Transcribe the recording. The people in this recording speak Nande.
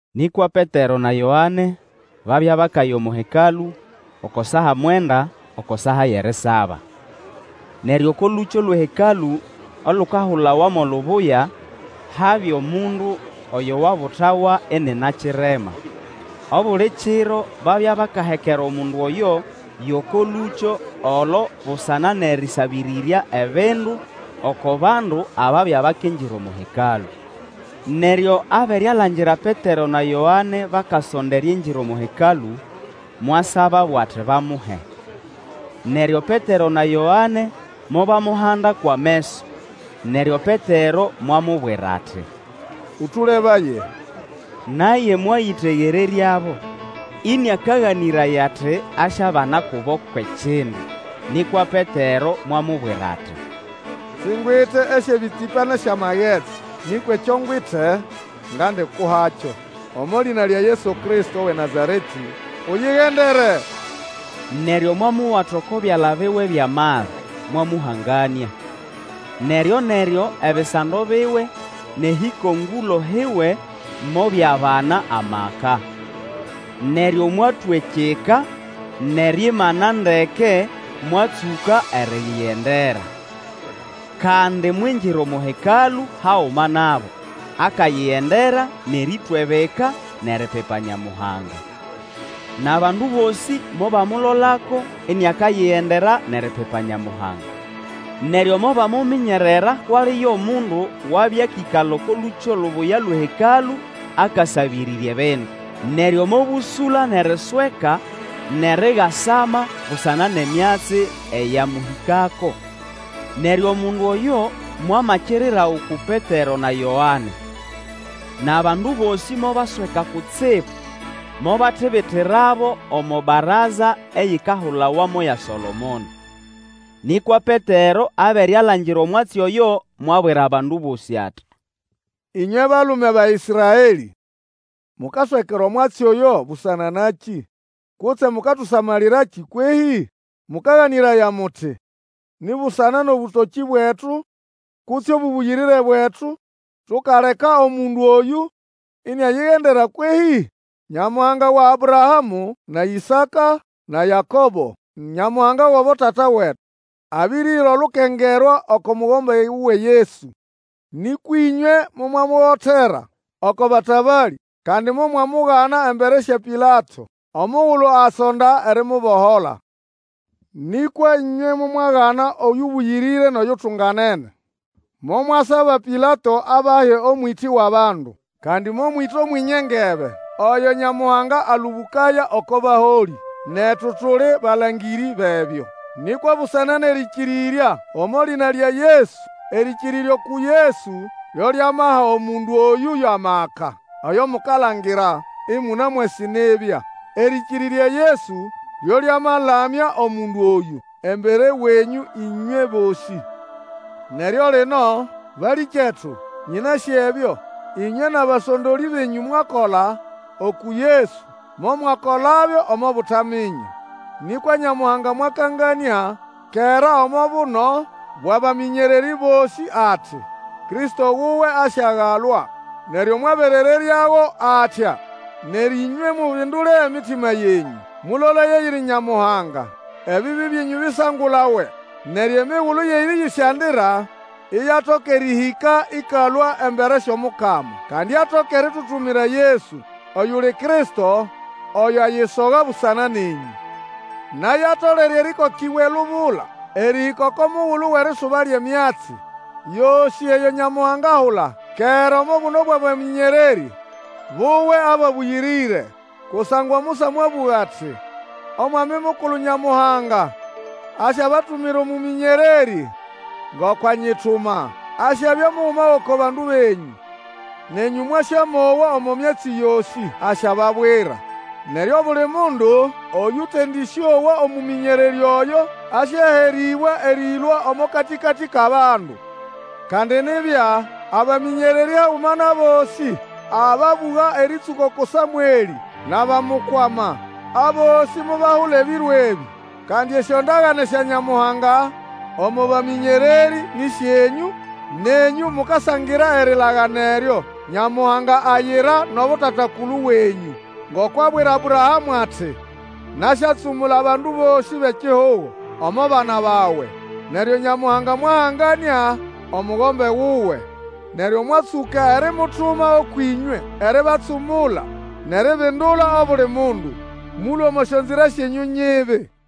Nĩkwa Petero na Yoane babya bakaya omo Hekalũ oko saa mwenda, oko saa yʼerisaba. Neryo oko lũkyo lwʼeHekalũ olukahulawa mo Lubuya habya amundu oyo wabutawa inina kirema. Obuli kiro babya bakahekera omundu oyo yʼoko lũkyo olo busana nʼerĩsabĩrĩrya ebindu oko bandu ababya bakingira omo Hekalũ. Neryo abere alangira Petero na Yoane bakasonda eriingira omo Hekalũ, mwasababo ati bamuhe. Neryo Petero na Yoane mobamuhanda kwʼameso, neryo Petero mwamubwira ati, Ũlũlebaye! Naye mwayĩtegereryabo, ĩnĩakaganĩraya ati asyabana kubo kwʼekindu. Nĩkwa Petero mwamubwira ati, Singwite esyʼebĩtsĩpa nʼesyamagetsi, nĩkwa ekyo ngwite ngandikuhakyo. Omo lĩna lya Yesu Kristo wʼeNazaretĩ, uyigendere! Neryo mwamuwata oko byala biwe byʼamali, mwamũhanganĩa. Neryo-neryo ebisando biwe nʼehĩkongũlo hiwe mobyabana amaka. Neryo mwatwa ekyika, nʼeriimana ndeke, mwatsũka eriyigendera. Kandi mwingira omo Hekalũ haguma nabo, akayigendera, nʼerĩtwa ebika, nʼeripipa Nyamuhanga. Nʼabandu bosĩ mobamulolako iniakayigendera nʼeripipa Nyamuhanga. Neryo mobamuminyerera kwʼali yo mundu wabya akĩkala oko Lũkyo Lubuya lwʼeHekalũ akasabĩrĩrya ebindu. Neryo mobũsũla nʼerisweka nʼerigasama busana nʼemyatsi eyamũhĩkako. Neryo omundu oyo mwamakirira uku Petero na Yoane. Nʼabandu bosĩ mobasweka kutsibu, mobatibitirabo omo baraza eyikahulawa mo ya Solomono. Nĩkwa Petero abere alangira omwatsi oyo, mwabwira bandu abo ati, Ĩnywe balume ba Ĩsraelĩ, mukaswekera omwatsi oyo busana nakĩ, kutse mukatusamalirakĩ kwehĩ? Mũkaganĩraya muti ni busana nʼobũtokĩ bwetu kutse obũbũyĩrĩre bwetu tukaleka omundu oyũ iniayigendera kwehĩ? Nyamuhanga wa Abrahamũ, na Ĩsaka, na Yakobo, Nyamuhanga wʼabotata wetu, abiriha olukengerwa oko Mugombe wuwe Yesu. Nĩkwa ĩnywe momwamuhotera oko batabalĩ, kandi momwamugana embere sya Pilato omugulu asonda erimubohola. Nĩkwa ĩnywe momwagana Oyũbũyĩrĩre nʼoyutunganene, momwasaba Pilato abahe omwĩtĩ wʼabandu. Kandi momwĩta Omwenye engebe, oyo Nyamuhanga alũbũkaya oko baholĩ. Netu tuli balangĩrĩ bʼebyo. Nĩkwa busana nʼerĩkĩrĩrya omo lĩna lya Yesu, erĩkĩrĩrya uku Yesu lyo lyamaha omundu oyũ yʼamaka, oyo mukalangira, ĩmũnamwasĩ nibya. Erĩkĩrĩrya Yesu lyo lyamalamya omundu oyũ embere wenyũ ĩnywe bosĩ. Neryo lino, balĩkyetu, nyĩnasĩ ebyo, ĩnywe nʼabasondolĩ benyũ mwakola uku Yesu, momwakolabyo omo butaminya. Nĩkwa Nyamuhanga mwakanganĩa kera omo buno bwʼabamĩnyererĩ bosĩ ati, Kristo wuwe asyagalwa; neryo mwaberereryago atya. Neryo ĩnywe mubindule emitima yenyũ mulolaye eyiri Nyamuhanga, ebibi byenyũ bisangulawe, neryo emigulu yʼerĩyĩsyandira iyatoka erĩhĩka ĩkalũa embere syʼOmukama, kandi atoke eritutumira Yesu, oyuli Kristo oyo ayisoga busana nenyũ. Naye atolere erĩkokĩbwa elubula erĩhĩka oko mugulu wʼerisuba lyʼemyatsi yosĩ eyo Nyamuhanga ahula kera omo buno bwʼabamĩnyererĩ buwe ababũyĩrĩre. Kusangwa Musa mwabũga ati, Omwami Mukulu Nyamuhanga asyabatumira omũmĩnyererĩ, ngoko anyituma. Asyabya muguma gʼoko bandu benyũ. Nenyũ mwasyamowa omo myatsi yosĩ asyababwira. Neryo obuli mundu oyũtendĩsyowa omũmĩnyererĩ oyo, asyaherĩbwa erĩlũa omo katĩkatĩ kʼabandu. Kandi nibya, abamĩnyererĩ haguma nʼabosĩ ababũga erĩtsũka uku Samwelĩ nʼabamukwama, abosĩ mobahula ebiro ebĩ. Kandi esyondagane sya Nyamuhanga omo bamĩnyererĩ nĩ syenyũ, nenyũ mukasangira erilagana eryo Nyamuhanga ayira nʼabotata-kulu wenyũ. Ngoko abwira Abrahamũ ati, Nasyatsumula abandu bosĩ bʼekihugo omo bana bawe. Neryo Nyamuhanga mwahanganĩa Omugombe wuwe, neryo mwatsũka erimutuma ũkwʼĩnywe eribatsumula nʼeribindula obuli mundu, mũlũe omo syonzira syenyũ nyibi.